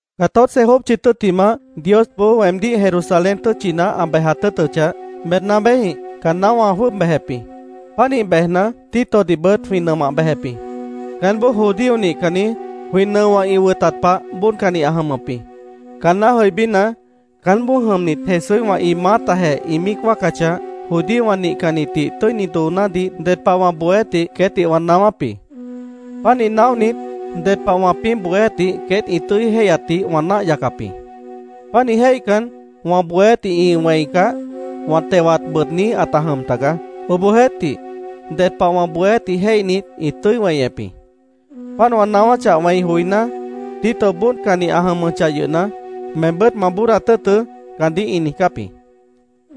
Catorce jópchi tʉ́ttimah, Diosboó weemdíh Jerusalén tʉ́tchina ã bejat tʉ́ʉtʉchah, Bernabéjĩh caanná wã jwʉ́ʉb bejep jĩ. Pánih bejna, Titodihbʉt jwĩ nʉmah bejep jĩ. Caánboó judío nihcanni, jwĩ nʉowã ĩ wʉtat pah bóodcanni ã jʉmʉp jĩ. Caanná jʉibína, caánboó jʉmnit Jesúíhwã ĩ maátajeh ĩ míic wáacachah, judíowã nihcannitdih tʉ́ini doonádih ded pah wã bohéátdih queétdih wã naáwáp jĩ. Pánih naóhnit, ded pah wãpĩ́ bohéátdih queét ĩ tʉ́i jéihyatdih wã náah yacap jĩ. Pánih jéihcan, wã bohéátdih ĩ wẽicah, wã tewat bʉʉdní ãta jʉm taga. Obohjeéhtih, ded pah wã bohéátdih jéihnit, ĩ tʉ́i weñep jĩ. Páant wã naáwáchah wẽi joiná, Tito bóodcanni ã jʉmʉchah yʉhna, “Meembʉ́t ma bóodat tʉ́ʉtʉ́”, caandíh ĩ niijcáp jĩ.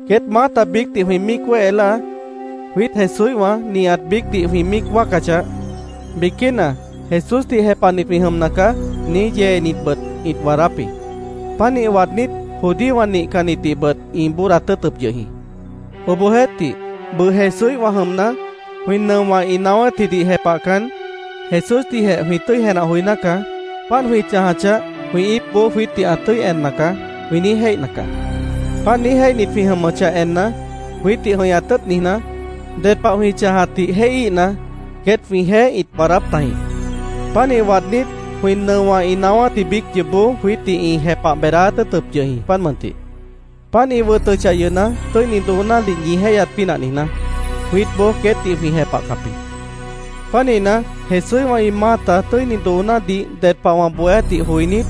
Queét maáta biícdih jwĩ míic wéhe láa, jwiít Jesúíhwã nihat biícdih jwĩ míic wáacachah, biquína “Jesúsdih jepahnit jwĩ jʉmna caá”, niíj yeenitbʉt ĩt waadáp jĩ. Pánih waadnít, judíowã nihcannitdihbʉt ĩ bóodat tʉ́ʉtʉp yʉh jĩ. Obohjeéhtih, bʉʉ Jesúíhwã jʉmna, jwĩ nʉowã ĩ naáwátjidih jepahcan, Jesúsdihjeh jwĩ tʉ́i jenah joiná caá. “Páant jwĩ chãjachah, jwĩ íipboó jwiítdih ã tʉ́i enna caá”, jwĩ niíj jéihna caá. Páant niíj jéihnit jwĩ jʉmʉchah enna, jwiítdih jʉ̃ihñat tʉ́ʉt niijná, ded pah jwĩ chãjatdih jéihíhna, queét jwĩjeéh ĩt waadáp tajĩ. Pánih waadnít, jwĩ nʉowã ĩ naáwátji biíc yoobó jwiítdih ĩ jepah beedáát tʉ́ʉtʉp yʉh jĩ, páant mʉntih. Páant ĩ wʉtʉchah yʉhna, tʉ́ini doonádih ñi jéihyat pínah niijná, jwiítboó queétdih jwĩ jepahcap jĩ. Pánihna, Jesúíhwã ĩ maáta tʉ́ini doonádih ded pah wã bohéátdih joinít,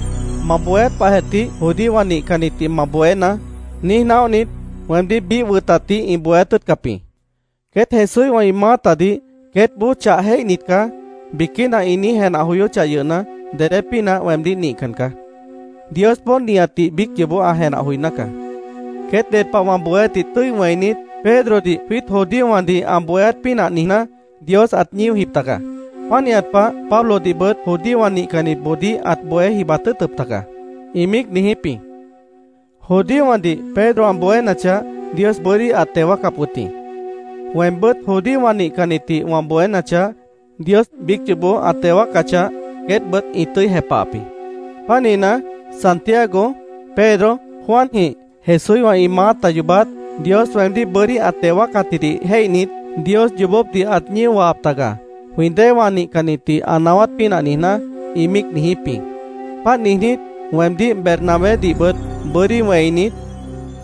“Ma bohéát pahjeh tih judíowã nihcannitdih ma bohénaá”, niíj naóhnit, weemdíh biíh wʉtatdih ĩ bohéát tʉ́ʉtcap jĩ. Queét Jesúíhwã ĩ maátadih “Queétboó chah jéihnit caá”, biquína ĩ niíj jenah joyóchah yʉhna, dedé pínah weemdíh nihcan caá. Diosboó nihatdih biíc yoobó ã jenah joiná caá. Queét ded pah wã bohéátdih tʉ́i wẽinit, “Pedrodih jwiít judíowãdih ã bohéát pínah niijná, Dios ãt ñíojip taga. Pánihat pah, Pablodihbʉt judíowã nihcannitboodíh ãt bohé jibat tʉ́ʉtʉp taga”, ĩ míic niijíp jĩ. Judíowãdih Pedro ã bohénachah, Dios bʉ́dí ãt teo wáacap wʉt jĩ. Weembʉ́t judíowã nihcannitdih wã bohénachah, Dios biíc yoobó ã teo wáacachah, queétbʉt ĩ tʉ́i jepahap jĩ. Pánihna, Santiago, Pedro, Juanjĩh, Jesúíhwã ĩ maáta yoobát, Dios weemdíh bʉ́dí ã teo wáacatjidih jéihnit, “Dios yoobópdih ãt ñío wahap taga, jwĩ déewã nihcannitdih ã naáwát pínah niijná”, ĩ míic niijíp jĩ. Páant niijnít, weemdíh Bernabédihbʉt bʉ́dí wẽinit,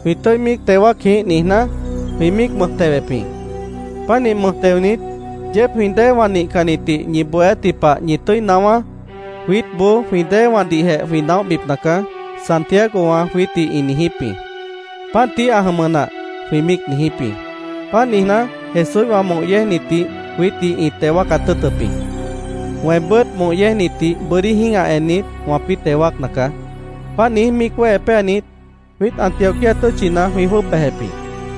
“Jwĩ tʉ́i míic teo wáac jĩíh”, niijná, jwĩ míic mʉj tewep jĩ. Pánih mʉj teonit, “Yeéb jwĩ déewã nihcannitdih ñi bohéátji pah ñi tʉ́i naáwá. Jwiítboó jwĩ déewãdihjeh jwĩ naóhbipna caá”, Santiagowã jwiítdih ĩ niijíp jĩ. “Páant tií ã jʉmʉ nah”, jwĩ míic niijíp jĩ. Páant niijná, Jesúíhwã moh yéejnitdih jwiítdih ĩ teo wáacat tʉ́ʉtʉp jĩ. Weembʉ́t moh yéejnitdih bʉ́dí jĩ́gah ennit, wãpĩ́ teo wáacna caá. Páant niíj míic wéhe péanit, jwiít Antioquía tʉ́tchina jwĩ jwʉ́ʉb bejep jĩ.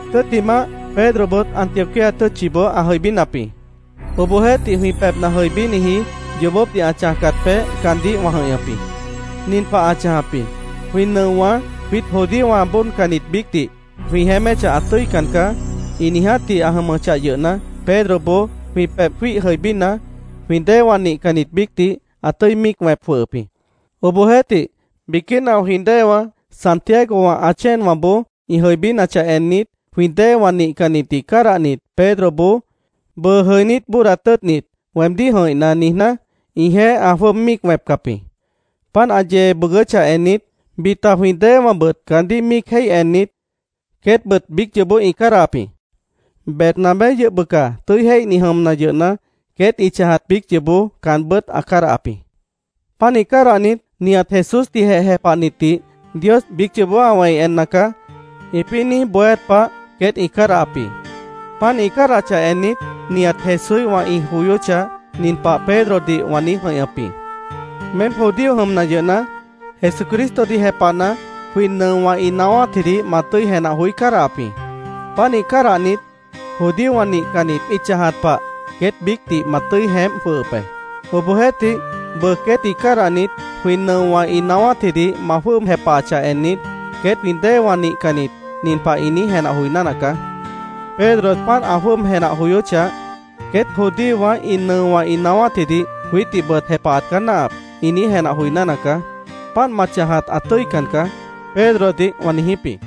Tʉ́ttimah, Pedrobʉt Antioquía tʉ́tchiboó ã jʉibínap jĩ. Obohjeéhtih, jwĩ pebhna jʉibíniji, yoobópdih ã chãjcat peéh caandíh wã jʉ̃ihñʉp jĩ. Nin pah ã chãjap jĩ: Jwĩ nʉowã “Jwiít judíowã bóodcannit biícdih jwĩ jeéméchah ã tʉ́ican caá”, ĩ niijátji ã jʉmʉchah yʉhna, Pedroboó jwĩ pebh jwíih jʉibína, jwĩ déewã nihcannit biícdih ã tʉ́i míic wẽp jwʉhʉp jĩ. Obohjeéhtih, biquína jwĩ déewã, Santiago ã chéenwãboó ĩ jʉibínachah ennit, jwĩ déewã nihcannitdih cádahnit, Pedroboó “Bʉʉ jʉinít bóodat tʉ́ʉtnit weemdíh jʉ̃ihná”, niijná, ĩjeéh ã jwʉ́ʉb míic wẽpcap jĩ. Páant ã yee bʉʉgʉ́chah ennit, bita jwĩ déewãbʉt caandíh míic jéih ennit, queétbʉt biíc yoobó ĩ cádahap jĩ. Bernabé yʉh bʉca tʉ́i jéihni jʉmna yʉhna, queét ĩ chãjat biíc yoobó caanbʉ́t ã cádahap jĩ. Pánih cádahnit, “Nihat Jesúsdihjeh jepahnitdih Dios biíc yoobó ã wẽi enna caá”, ĩpĩ́ niíj bohéát pah queét ĩ cádahap jĩ. Páant ĩ cádahachah ennit, nihat Jesúíhwã ĩ joyóchah, nin pah Pedrodih wã niíj jʉ̃ihñʉp jĩ: “Meém judío jʉmna yʉhna, Jesucristodih jepahna, jwĩ nʉowã ĩ naáwátjidih ma tʉ́i jenah joí cádahap jĩ. Pánih cádahnit, judíowã nihcannit ĩ chãjat pah queét biícdih ma tʉ́i jeémp jwʉhʉp be. Obohjeéhtih, bʉʉ queétdih cádahnit, jwĩ nʉowã ĩ naáwátjidih ma jwʉ́ʉb jepahachah ennit, queét jwĩ déewã nihcannit nin pah ĩ niíj jenah joiná nacaá: ‘Pedro páant ã jwʉ́ʉb jenah joyóchah, queét judíowã ĩ nʉowã ĩ naáwátjidih jwiítdihbʉt jepahat caá náahap’, ĩ niíj jenah joiná nacaá. Páant ma chãjat ã tʉ́ican caá”, Pedrodih wã niijíp jĩ.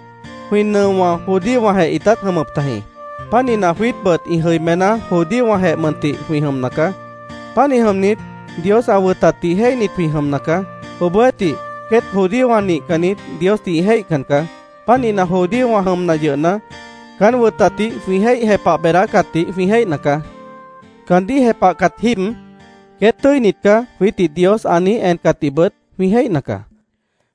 Jwĩ nʉowã judíowãjeh ĩtát jʉmʉp tajĩ. Pánihna, jwiítbʉt ĩ jʉimená judíowãjeh mʉntih jwĩ jʉmna caá. Pánih jʉmnit, Dios ã wʉtatdih jéihnit jwĩ jʉmna caá. Obohjeéhtih, queét judíowã nihcannit Diosdih ĩ jéihcan caá. Pánihna judíowã jʉmna yʉhna, caán wʉtatdih jwĩ jéih jepah beedácatdih jwĩ jéihna caá. Caandíh jepahcat jíib “Queét tʉ́init caá”, jwiítdih Dios ã niíj encatdihbʉt jwĩ jéihna caá.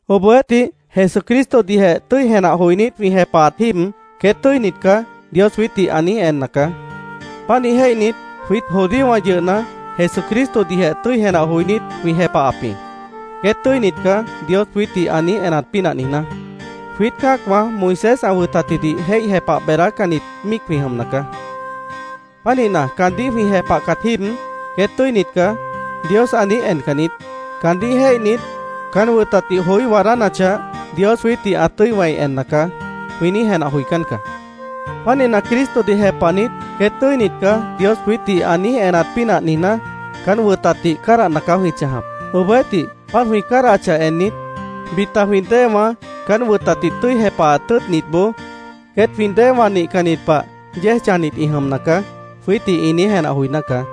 Obohjeéhtih, Jesucristodihjeh tʉ́i jenah joinít jwĩ jepahat jíib, “Queét tʉ́init caá”, Dios jwiítdih ã niíj enna caá. Pánih jéihnit, jwiít judíowã yʉhna, Jesucristodihjeh tʉ́i jenah joinít, jwĩ jepahap jĩ, “Queét tʉ́init caá”, Dios jwiítdih ã niíj enat pínah niijná. Jwiít cã́acwã Moisés ã wʉtatjidih jéih jepah beedácannit míic jwĩ jʉmna caá. Pánihna, caandíh jwĩ jepahcat jíib, “Queét tʉ́init caá”, Dios ã niíj encan niít. Caandíh jéihnit, “Caán wʉtatdih joí waadánachah, Dios jwiítdih ã tʉ́i wẽi enna caá”, jwĩ niíj jenah joicán caá. Pánihna, Cristodih jepahnit, “Queét tʉ́init caá”, Dios jwiítdih ã niíj enat pínah niijná, caán wʉtatdih cádahna caá jwĩ chãjap. Obohjeéhtih, páant jwĩ cádahachah ennit, bita jwĩ déewã caán wʉtatdih tʉ́i jepahat tʉ́ʉtnitboó “Queét jwĩ déewã nihcannit pah yéej chãjnit ĩ jʉmna caá”, jwiítdih ĩ niíj jenah joiná caá.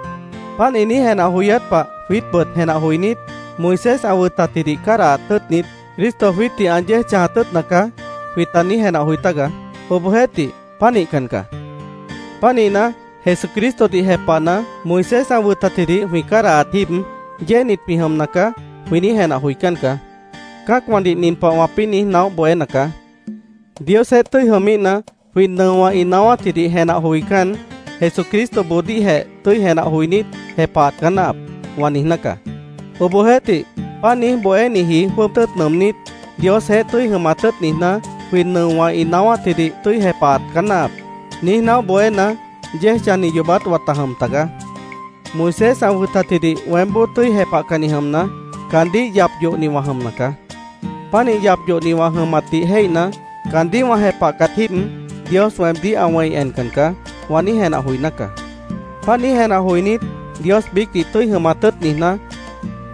Páant ĩ niíj jenah joyát pah jwiítbʉt jenah joinít, “Moisés ã wʉtatjidih cádahat tʉ́ʉtnit, Cristo jwiítdih ã yéej chãjat tʉ́ʉtna caá”, jwĩta niíj jenah joi tágaá. Obohjeéhtih, páant nihcan caá. Pánihna, “Jesucristodih jepahna, Moisés ã wʉtatjidih jwĩ cádahat jíib, yéejnit jwĩ jʉmna caá”, jwĩ niíj jenah joicán caá. Cã́acwãdih nin pah wãpĩ́ niíj naóh bohéna caá: “Diosjeéh tʉ́i jʉmíhna, jwĩ nʉowã ĩ naáwátjidih jenah joicán, Jesucristoboodíhjeh tʉ́i jenah joinít, jepahat caá náahap”, wã niijná caá. Obohjeéhtih, páant niíj bohéniji jwʉ́ʉb tʉ́ʉt nʉʉmnít, “Diosjeéh tʉ́i jʉmat tʉ́ʉt niijná, jwĩ nʉowã ĩ naáwátjidih tʉ́i jepahat caá náahap”, niíj naóh bohéna, yéej chãjni yoobát wãta jʉm tagaá. Moisés ã wʉtatjidih weémboó tʉ́i jepahcanni jʉmna, caandíh yap yohni wã jʉmna caá. Pánih yap yohni wã jʉmatdih jéihna, “Caandíh wã jepahcat jíib, Dios weemdíh ã wẽi encan caá”, wã niíj jenah joiná caá. Páant niíj jenah joinít, Dios biícdih tʉ́i jʉmat tʉ́ʉt niijná,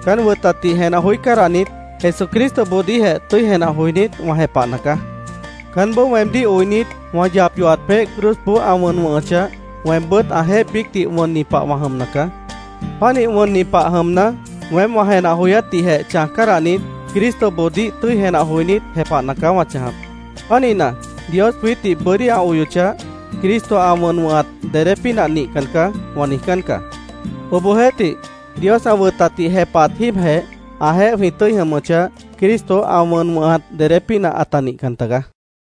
caán wʉtatdih jenah joí cádahnit, Jesucristoboodíhjeh tʉ́i jenah joinít, wã jepahna caá. Caánboó weemdíh oinit, wã yap yohat peéh cruzboó ã wʉn wʉ̃hʉchah, weembʉ́t ãjeéh biícdih wʉnni pah wã jʉmna caá. Pánih wʉnni pah jʉmna, weém wã jenah joyátdihjeh chãj cádahnit, Cristoboodíh tʉ́i jenah joinít, jepahna caá wã chãjap. Pánihna, “Dios jwiítdih bʉ́dí ã oyochah, Cristo ã wʉn wʉ̃hat dedé pínah nihcan caá”, wã niijcán caá. Obohjeéhtih, Dios ã wʉtatdih jepahat jíibjeh ãjeéh jwĩ tʉ́i jʉmʉchah, Cristo ã wʉn wʉ̃hat dedé pínah ãta nihcan tagaá.